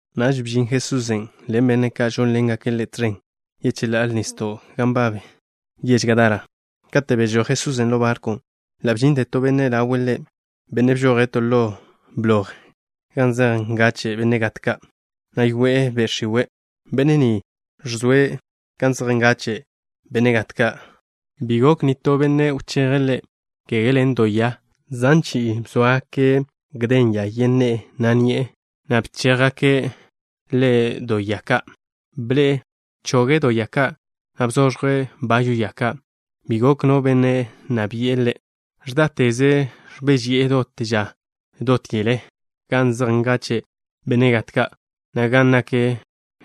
Naž bžin Jesusen' ḻen benne' ka' žónḻengake' Ḻe' tẕen yecheḻá'a nisdo' gan nbab che yež Gadara. Kate' bežój Jesusen' ḻo barkwn', ḻa' bžinte to benne' ḻawe' Ḻe', benne' bžoje' to ḻo bloj gan zej ngache' benne' gat ka', na' yoe'e be' x̱iwe'. Benne' ni ẕzoe' gan zej ngache' benne' gat ka'. Bi gok nitó benne' wcheje' ḻe', kege ḻen do ya. Zan chi'i bzóagake' bayw ya yen ne'e, na' ni'e, na' bchéjgake' ḻe' do ya ka'. Ble'e do ya ka', na' bzoẕje' bayw ya ka'. Bi gok no benne' nna bi'e ḻe'. Ẕdáteze' ẕbéžeyi'e dot ža dot yele gan zej ngache' benne' gat ka', na' gan nak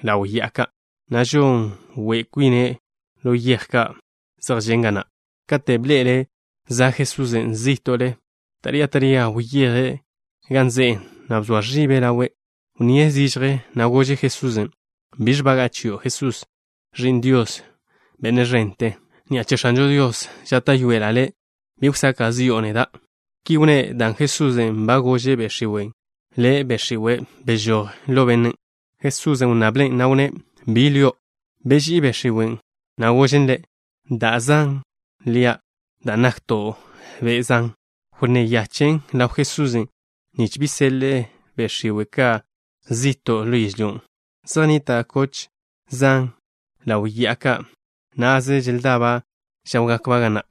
ḻaw ya'ado' ka', na' žon we' kwine' ḻo yej ka' zej žen' ga na'. Kate' bḻe'ele' za' Jesusen' zí'to'le, taría taría wyeje' gan ze'e, na' bzoa ẕibe' ḻawe'. Wnníe' zižje, na' gože' Jesusen': —¿Biẕ nbaga'a chio', Jesús, Ẕi'n Dios, Benne' ẕente? Ni'a che X̱anžo Dios žáta'yoela' le', bi wsaka' zi'o neda'. Ki wnné' dan' Jesusen' ba gože' be' x̱iwen': —Le', be' x̱iwe', bežój ḻo bennen'. Jesusen' wnnablen', na' wnné': —¿Bi lio'? Beží'i be' x̱iwen', na' gožen Ḻe': —Da' Zan lia' dan' nakto' be' zan. Wnné yachen' ḻaw Jesusen' nich bi seḻe'e be' x̱iwe' ka' zi'to' ḻo yežlyón'. Zej nnita' koch zan ḻaw ya'ado' na'ze, želdaba' žáwgakba' ga na'.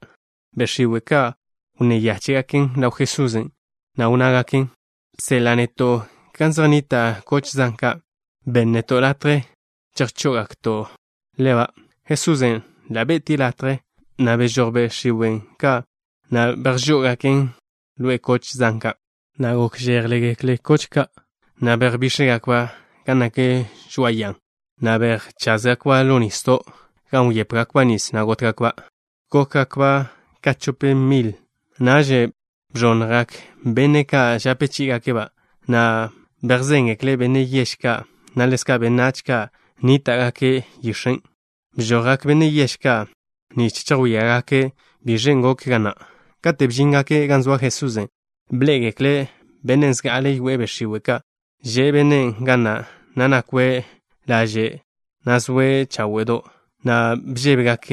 Be' x̱iwe' ka' wnné yáche'gaken ḻaw Jesusen', na' wnnágaken: —Bseḻa' neto' gan zej nnita' koch zan ka'. Benn neto' latje chejžó'ogakto'-ba'. Jesusen' ḻa' be'tie' ḻégaken latje, na' bežojgak be' x̱iwe' ka', na' bejžó'ogaken koch zan ka', na' bx̱íte'gak koch ka', na' bejbíx̱jgakba' gan nak žoa'a ya'a, na' bejcházgakba' ḻo nisdo', gan wyépegakba' nis, na' gótgakba'. Gókgakba' ka chop milba'. Naž bẕonnjgak benne' ka' žape chí'igake' koch ka', na' bejzéngekle' benne' yež ka', na' ḻezka' benách ka' nníta'gake' yix̱en'. Bžojgak benne' yež ka', nich chejwíagake' biẕen' goken ga na'. Kate' bžíngake' gan zoa Jesusen', bḻé'egekle' bennen' zga'ale yoe'e be' x̱iwe' ka'. Že' bennen' ga na', na' nakwe' laže', na' zoe' cháwe'do', na' bžébegak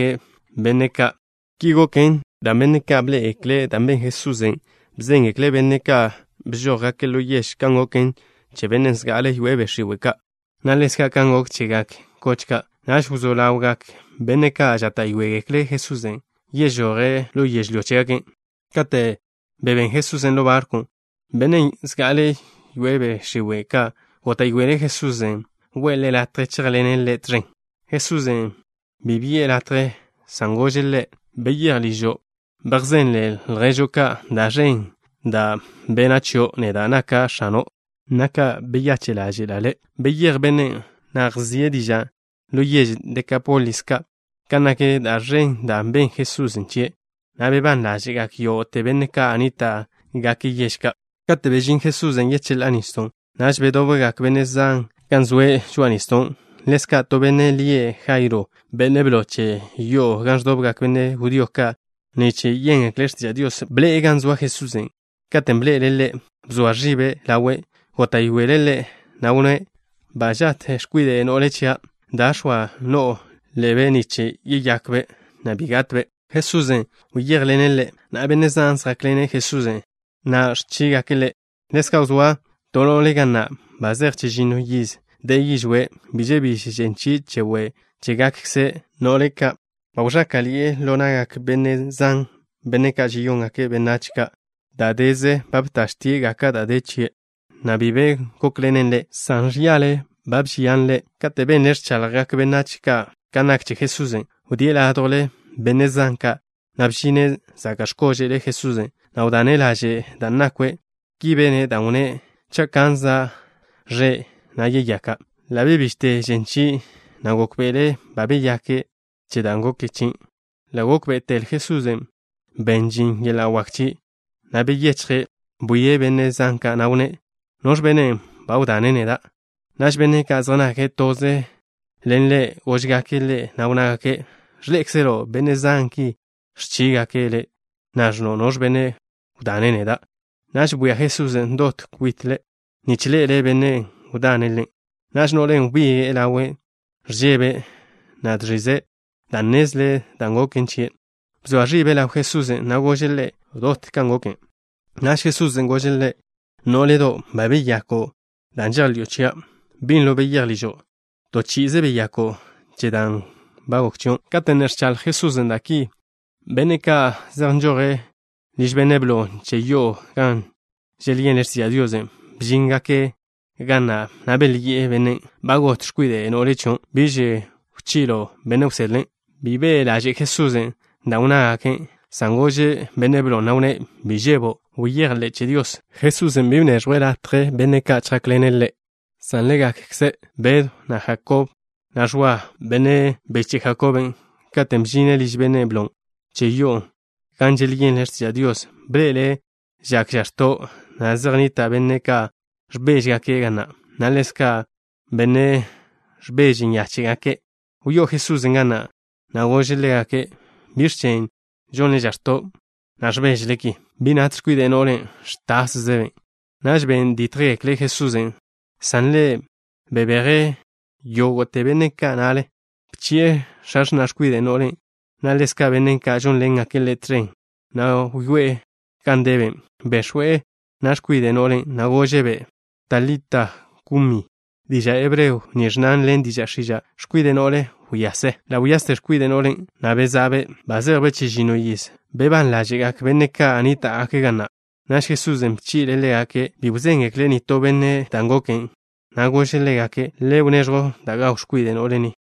benne' ka'. Ki goken dan' benne' ka', benne' bḻé'egekle' da' ben Jesusen' bzéngekle' benne' ka' bžójgake' ḻo yež kan goken che bennen' zga'ale yoe'e be' x̱iwe' ka', na' ḻezka' kan gok chegak koch ka'. Naž wzó ḻawgak benne' ka' žáta'yoegekle' Jesusen' yežoje' ḻo yežlyó chégake'. Kate' bebén Jesusen' ḻo barkw, bennen' zga'ale yoe'e be' x̱iwe' ka', góta'yoele' Jesusen' we'e ḻe' latje chéjḻene' Ḻe' tẕen. Jesusen' bi bi'e ḻe' latje, san gože' ḻe': —Beyéj ližo'. Bejzenle lježo' ka' da' ẕen da' bena' chio' neda', naka' X̱ano', na' ka beyache' ḻáže'la' le'. Beyéj bennen', na' wzíe' diža' ḻo yež Dekápolis ka' kan nak da' ẕen da' ben Jesusen' chie', na' bebán ḻáže'gak yógo'te benne' ka' nníta'gake' yež ka'. Kate' bežín Jesusen' yecheḻá'a nisdon', naž bedobgak benne' zan gan zoe' žoa'a nisdon'. Ḻezka' to benne' lie' Jairo, benne' blo che yo'o gan ẕdobgak benne' judío ka' nich yéngekle' x̱tiža' Dios, bḻe'e gan zoa Jesusen'. Katen' bḻe'ele' Ḻe', bzoa ẕibe' ḻawe'. Góta'yoele' Ḻe', na' wnné': —Za' gat x̱kwide' no'le chia'. Da, x̱oa no'o ḻebe' nich yeyakbe', na' bi gatbe'. Jesusen' wyéjḻene' ḻe', na' benne' zan zjákḻene' Jesusen', na' ẕchígake' Ḻe'. Ḻezka' zoa to no'le ga na', ba zej chežinno yiz de'e yižwé'. Bi žebíž žen chie' che we' chégakkze no'le ka'. Ba wẕáka'ḻi'e ḻo na'gak benne' zan, benne' ka' žeyóngake' benách ka'. Dáche'ze ba btie' dot da' wdape', na' bi be gókḻenen ḻe', san žyáḻa'žen chie'. Kate' benle' ẕchaḻjgak benách ka' kan nak che Jesusen', wdíe' ládjwle benne' zan ka', na' bžine' zaka' x̱kože'l Jesusen', na' wdane' laže' da' nakwe'. Ki bene' dan' wnné': “Cha' kanza' ẕe', yeyaka'.” Ḻa' bebižte žen chie', na' gókbe'ele' ba beyake' che da' goken chie'. Ḻa' gókbe'etel Jesusen' ben žin yeḻa' wak chie', na' beyechje'. Bwie' benne' zan ka', na' wnné': —¿Noẕ benne' wdane' neda'? Naž benne' ka' zej nake' toze ḻen Ḻe' góžgake' Ḻe', na' wnnágake': —Ẕḻé'ekzelo' benne' zan ki ẕchígake' Le', na' ẕnno': “¿Noẕ benne' wdane' neda'?” Naž bwia Jesusen' dot kwite' nich ḻe'ele' bennen' wdane' Ḻe'. Naž no'len' wbige'e ḻawe'. Ẕžebe', na' žẕize', dan' nnezle' dan' goken chie'. Bzoa ẕibe' ḻaw Jesusen', na' gože' Ḻe' dot dan' goken. Naž Jesusen' gože' ḻe': —Nó'ledo'. Ba beyako' dan' žejḻi'o chia'. Binlo beyéj ližo'. To chi'ize beyako' che dan' goken chio'. Kate' ne ẕchaḻj Jesusen' da' ki, benne' ka' zej nžoje' liž benne' blon' che yo'o gan želyenle' x̱tiža' Dios, bžíngake' ga na', na' belyi'e bennen': —Ba got x̱kwide' no'le chio'. Biž wpižjo' benne' wsedle. Bi be' ḻaže' Jesusen' dan' wnnágake', san gože' benne' blon', na' wnné': —Bi žebo'. Bejḻe'ze che Dios. Jesusen' bi bneẕjwe' yezika' benne' ka' latje chjákḻene' Ḻe', san ḻégakze Bedw, na' Jakob, na' Ẕwa, benne' biche' Jakoben'. Katen' bžine' liž benne' blon' che yo'o gan želyenle' x̱tiža' Dios, bḻe'ele' žak žax̱to', na' zej nnita' benne' ka' ẕbéžegake' ga na', na' ḻezka' benne' ka' ẕbeže nyáche'gake'. Wyó'o Jesusen' ga na', na' gože' ḻégake': —¿Biẕ chen' žonle žax̱to', na' ẕbéžele ki? Bi nat x̱kwide' no'len'. Ẕtászebe'. Naž ben dítjgekle' Jesusen', san Ḻe' bebeje' yógo'te benne' ka' na'le. Bchi'e x̱a x̱na' x̱kwide' no'len', na' ḻezka' benne' ka' žónḻengake' Ḻe' tẕen, na' wyoé'e gan debe'. Bex̱we' na' x̱kwide' no'len', na' gože'-be': —Talita, kumi. Diža' hebreo ni ẕnnan ḻen diža' x̱iža': “X̱kwide' no'le, wyase.” Ḻa' wyaste x̱kwide' no'len', na' beza'be'. Ba zejbe' chežinno yiz. Bebán ḻáže'gak benne' ka' nníta'gake' ga na'. Naž Jesusen' bchi'le' ḻégake' bi wzéngekle' nitó benne' dan' goken. Na' gože' ḻégake': —Le gonn da' gaw x̱kwide' no'le ni.